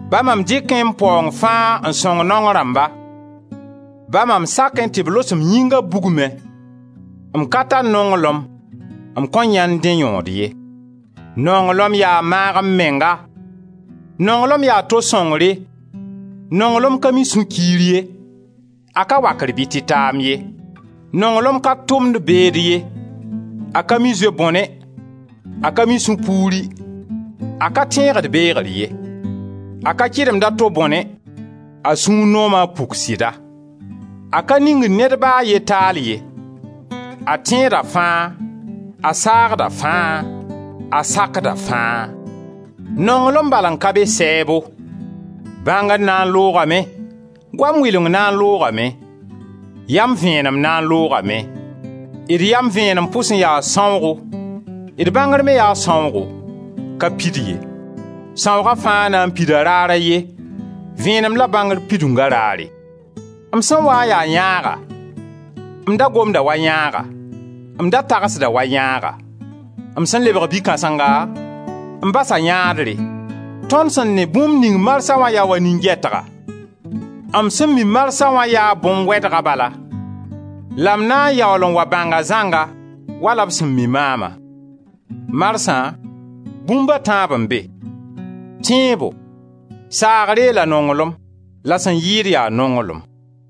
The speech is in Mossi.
Ba mam dɩkẽ m paoong fãa n sõng naong rãmba; ba mam sakẽ tɩ b los m yĩnga bugmẽ, m ka tar nonglem, m kõn yãend dẽ yõod ye. Nonglem yaa maag-m-menga, nonglem yaa to sõngre, nonglem ka mi sũ-kiir ye, a ka wakr bɩ tɩtaam ye. Nonglem ka tʋmd beed ye, a ka mi zoe-bõne, a ka mi sũ-puuri, a ka tẽegd beegr ye. A ka kɩdemd a to bõne; a sũur nooma a puk sɩda. A ka ningd ned ba a ye taal ye; a tẽeda fãa, a saagda fãa, a sakda fãa. Nonglem bal n ka be sɛɛbo. Bãngr na n loogame, goam wɩleng na n loogame, yam vẽenem na n loogame. D yam vẽenem pʋs n yaa sãoogo, d bãngr me yaa sãoogo, ka pid ye. Sãooga fãa na n pida raar a ye, vẽenem la bãngr pidunga raare. M sẽn waa n ya yãaga, m da gomda wa yãaga, m da tagsda wa yãaga; m sẽn lebg bi-kãsenga, m basa yãadre. Tõnd sẽn ne bũmb ning marsa wã yaa wa ne nin-gɛtga; m sẽn mi marsa wã yaa bõn-wɛdga bala la m na yaool n wa bãnga zãnga, wala b sẽn mi maama. Marsã bũmb a tãab n be: tẽebo, saagre la nonglem la sẽn yɩɩd yaa nonglem.